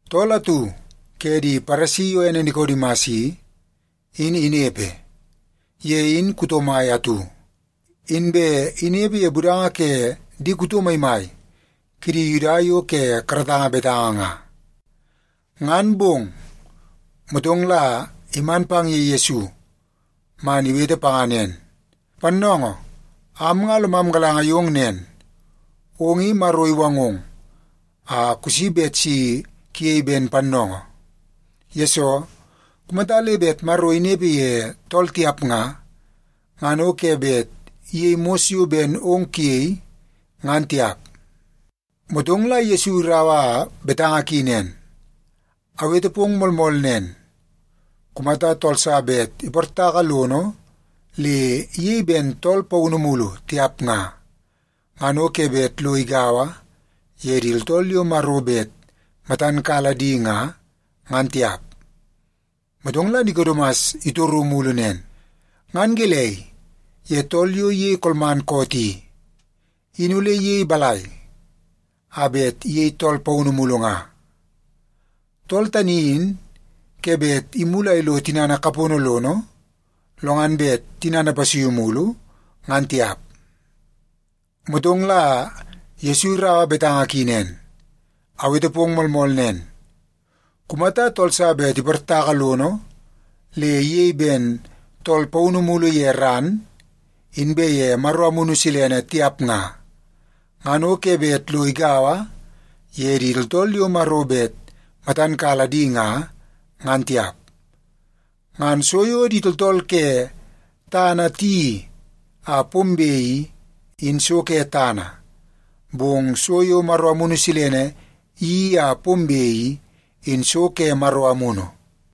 Tool atu ke di Paresi yo ene Nikodimas i, in inepe. Ye in kuto mai atu, inbe inepe ye budanga ke di kuto maimai kidi Yuda yo ke karatanga betanga nga. Ngan bong, motong la iman pang ye Yesu man iwete panga nen, “Pannoongoo, am nga lomam galanga yong nen, ong i Maro iwangong a kusi bet si kuyei ben pannoongoo. Yesoo, kumata le bet Maro inepe ye tool tiap nga, ngan o ke bet iyei mos yo ben ong kuyei, ngan tiap.” Motong la Yesu iraua betanga ki nen, “Awete pong moolmool nen, kumata tool sa bet iportaka lono le iyei ben tool paunu mulu tiap nga, ngan o ke bet lo igaua ye di tooltool yo Maro bet matan kala di nga, ngan tiap.” Motong la Nikodimas itoru mulu nen, “Ngan gelei ye tool yo iyei kolman koot i, in ole iyei balai a bet iyei tool paunu mulu nga? Tool tani in ke bet imulu a ilo tinana kapono lono, lo ngan bet tinana ipasuiu mulu, ngan tiap.” Motong la Yesu iraua betanga ki nen, “Awete pong moolmool nen, kumata tool sa bet iportaka lono le iyei ben tool paunu mulu ye ran, inbe ye Maro Amunu Silene, tiap nga, ngan o ke bet lo igaua ye di tooltool yo Maro bet matan kala di nga, ngan tiap. Ngan so yo di tooltool ke tana tiyeii a pombe i, in so ke tana, bong so yo Maro Amunu Silene iyeii a pombe i, in so ke Maro Amunu.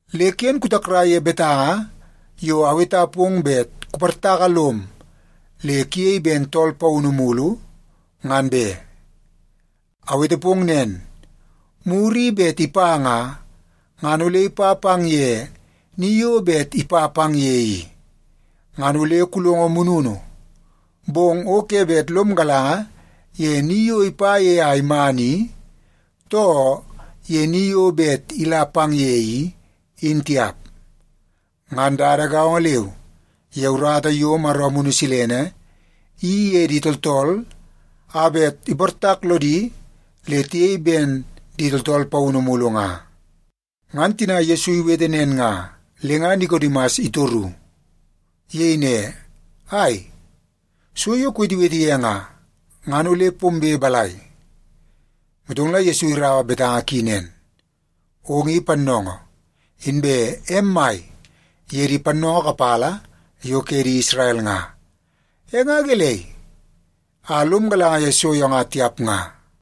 Le ken kutakrai ye betanga yo aweta pong bet kuportaka lom le kuyei ben tool paunu mulu, ngan be. Awete pong nen, muru i bet ipa nga, ngan ole ipa pang ye ni yo bet ipa pang ye i. Ngan ole kulongo mununu, bong o ke bet lom galanga ye ni yo ipa ye a iman i, too ye ni yo bet ila pang ye i, in tiap. Ngan dada gaongo leu, ye urata yo Maro Amunu Silene iyeii ye di tooltool a bet iportak lodi le tiyei ben di tooltool paunu mulu nga.” Ngan tina Yesu iwete nen nga, le nga Nikodimas itoru. Iyei ne, “Ai, so yo kuwetewete ye nga, ngan ole pombe balai?” Motong la Yesu iraua betanga ki nen, “Ong i pannoongoo, inbe em mai ye di pannoongoo kapala yo ke di Isrel nga. E nga gelei a lom galanga ye so nga tiap nga?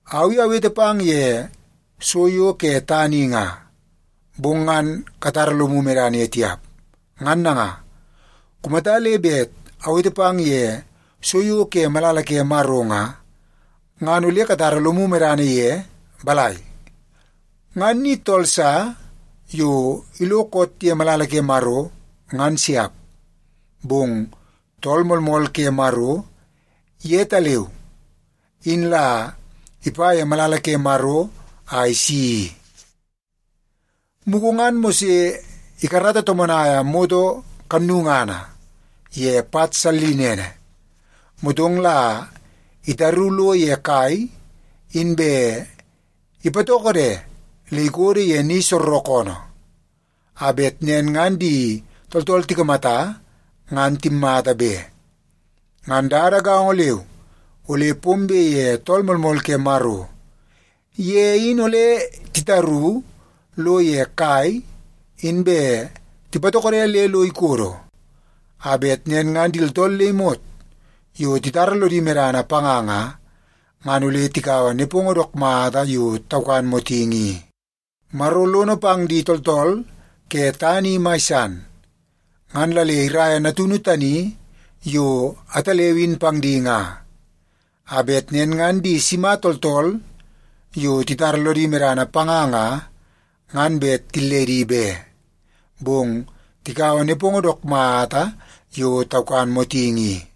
Au i awete pang ye so yo ke tana i nga, bong ngan katara lomu medana ye tiap. Ngan nanga, kumata le bet awete pang ye so yo ke malala ke Maro nga, ngan ole katara lomu medana ye balai? Ngan ni tool sa yo ilo koot ye malala ke Maro, ngan siap. Bong Tool Moolmool ke Maro yetaleu in la ipa ye malala ke Maro a isi i. Mugu ngan Mose ikarata tomonaia moto kannungana ye pat sallinene, motong la itaru lo ye kai inbe ipatokode le ikodo ye ni soorookoonoo, a bet nen ngan di tooltool tikamata ngan timmata be. Ngan dada gaongo leu ole pombe ye Tool Moolmool ke Maro. Ye in ole titaru lo ye kai inbe tipatokode le lo ikodo, a bet nen ngan di tooltool le imot yo titara lodi medana panga nga, ngan ole tikaua nepongo dook mata yo taukan motingi i. “Maro lono pang di tooltool ke tana i mai san, ngan la le iraia Natunu tani yo ataleu in pang di nga, a bet nen ngan di sima tooltool yo titara lodi medana panga nga, ngan bet tilledi be, bong tikaua nepongo dook mata yo taukan motingi i.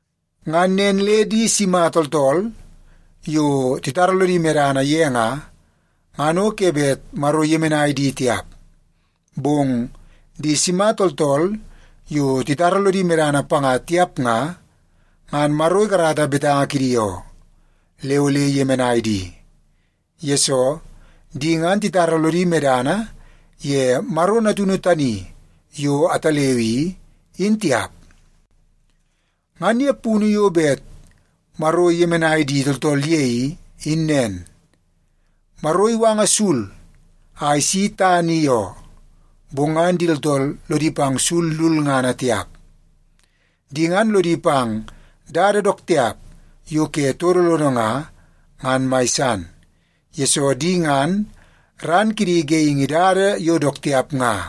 Ngan nen le di sima tooltool yo titara lodi medana ye nga, ngan o ke bet Maro iyemenai di tiap. Bong di sima tooltool yo titara lodi medana panga tiap nga, ngan Maro ikarata betanga kidi oo, le ole iyemenai di. Yesoo, di ngan titara lodi medana ye Maro Natunu tani yo ataleu i, in tiap. Ngan ye punu yo bet Maro iyemenai di tooltool ye i, in nen: Maro iwanga sul a isi tana i oo, bong ngan di tooltool lodi pang sul lulngana tiap. Di ngan lodi pang dada dook tiap yo ke todo lono nga, ngan mai san, yesoo di ngan ran kidi geingi dada yo dook tiap nga.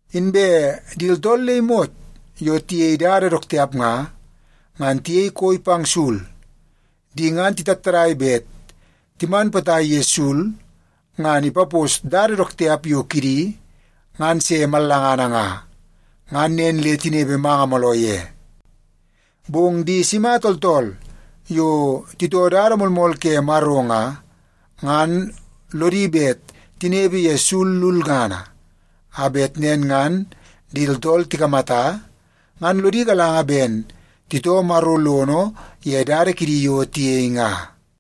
Inbe di tooltool le imot yo tiyei dada dook tiap nga, ngan tiyei koi pang sul. Di ngan titattadai bet timan potai ye sul ngan ipapos dada dook tiap yo kidi ngan se mallangana nga, ngan nen le tinepe manga mooloo ye. Bong di sima tooltool yo titoo dada moolmool ke Maro nga, ngan lodi bet tinepe ye sul lulngana, a bet nen ngan di tooltool tikamata, ngan lodi galanga ben titoo Maro lono ye dada kidi yo tiyei nga.”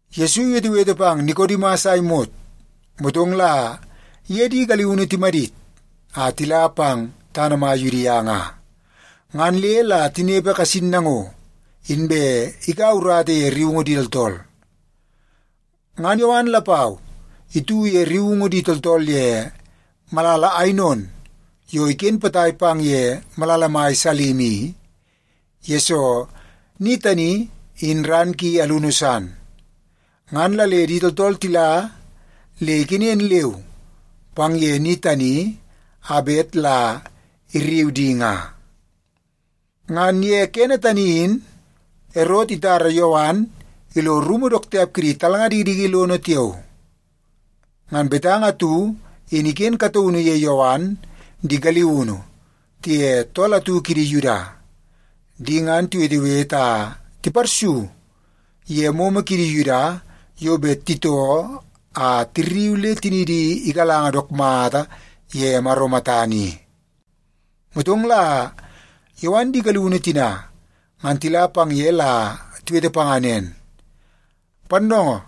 Yesu iwetewete pang Nikodimas a imot, motong la iye di galiunu timadit a tila pang tana mai Yudia nga. Ngan le la tinepe kasin nango, inbe ikaua urata ye rriungu di tooltool. Ngan Yowan lapau itu ye rriungu di tooltool ye malala Ainon yo iken potai pang ye malala mai Salim i, yesoo ni tani in ran ki alunu san. Ngan la le di tooltool tila le ikenen leu pang ye ni tani a bet la irriu di nga. (Ngan ye kene tani in Erot itara Yowan ilo rumu dook tiap kidi talnga dikidiki lono tiao.) Ngan betanga atu in iken kataunu ye Yowan di galiunu tiye tool atu kidi Yuda. Di ngan tiwetewete a tiparsu ye momo kidi Yuda yo bet titoo a tirriu le tinidi igalanga dook mata ye Maro matana i. Motong la Yowan di galiunu tina ngan tila pang ye la tiwete panga nen, “Pannoongoo,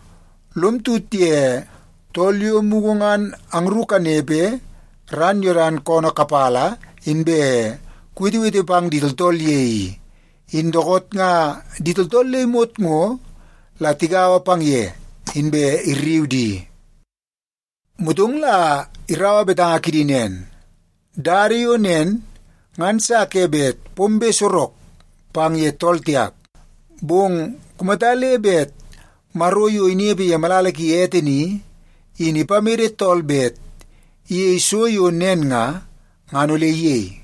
lom tut ye tool yo mugu ngan angru kanepe ran Yodan koonoo kapala, inbe kuwetewete pang di tooltool ye i, in dookoot nga di tooltool le imot ngo la tigaua pang ye, inbe irriu di.” Motong la iraua betanga kidi nen, “Dada yo nen ngan sa ke bet pombe sorok pang ye tool tiap. Bong kumata le bet Maro yo inepe ye malala ki ete ni, in ipamede tool bet iyei so yo nen nga, ngan ole iyei.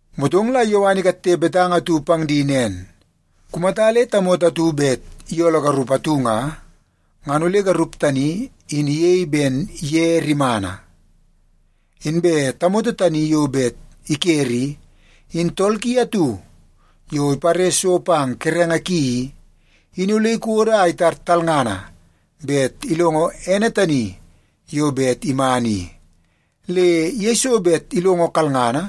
Motong la Yowan ikatte betanga atu pang di nen, “Kumata le tamoto atu bet iyooloo garup atu nga, ngan ole garup tani in iyei ben ye rimana. Inbe tamoto tani yo bet ikere i, in tool ki atu yo ipare so pang kerenge ki i, in ole ikodo a itar talngana bet ilongo ene tani yo bet iman i. Le yeiso bet ilongo kalngana,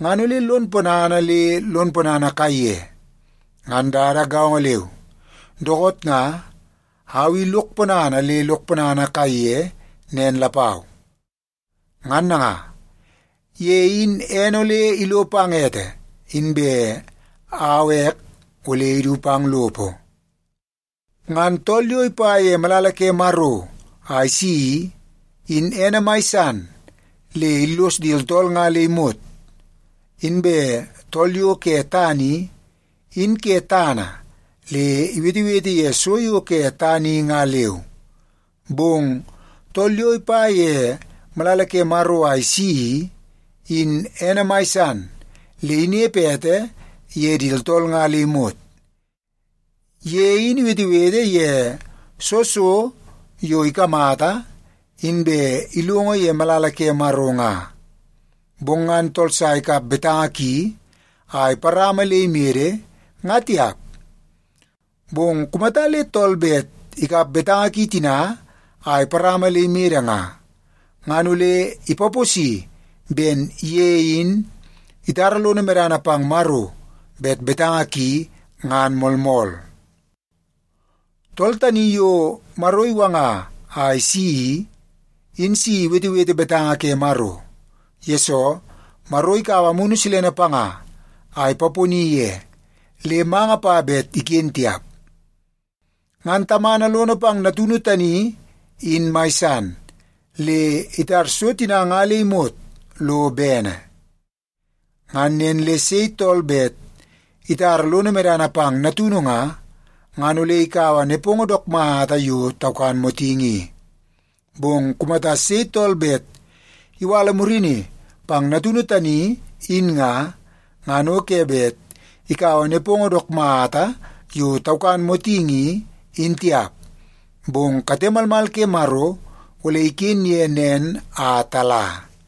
ngan ole lon ponana le lon ponana kaiye. Ngan dada gaongo leu, dookoot nga au i lok ponana le lok ponana kaiye nen lapau. Ngan nanga, ye in ene ole ilo pang ete, inbe au ek ole idu pang lopo. “Ngan tool yo ipa ye malala ke Maro a isi i, in ene mai san le illos di tooltool nga le imot. Inbe tool yo ke tana i, in ke tana le iwetewete ye so yo ke tana i nga leu. Bong tool yo ipa ye malala ke Maro a isi i, in ene mai san le inepe ete ye di tooltool nga le imot. Ye in iwetewete ye soo so yo ikamata inbe ilongo ye malala ke Maro nga. Bong ngan tool sa ikap betanga ki a iparama le imede, nga tiap. Bong kumata le tool bet ikap betanga ki tina a iparama le imede nga, ngan ole ipaposi ben ye in itara lono medana pang Maro bet betanga ki ngan moolmool. Tool tani yo Maro iwanga a isi i, in si iwetewete betanga ke Maro. Yesoo, Maro ikaua Amunu Silene panga a ipaponi ye, le manga pa bet iken tiap. Ngan Tamana lono pang Natunu tani in mai san, le itar so tina nga le imot lo bene. Ngan nen le sei tool bet itara lono medana pang Natunu nga, ngan ole ikaua nepongo dook mata yo taukan motingi i. Bong kumata sei tool bet iwala murini pang Natunu tani, in nga, ngan o ke bet ikaua nepongo dook mata yo taukan motingi i, in tiap. Bong kate malmal ke Maro ole iken ye nen a tala.”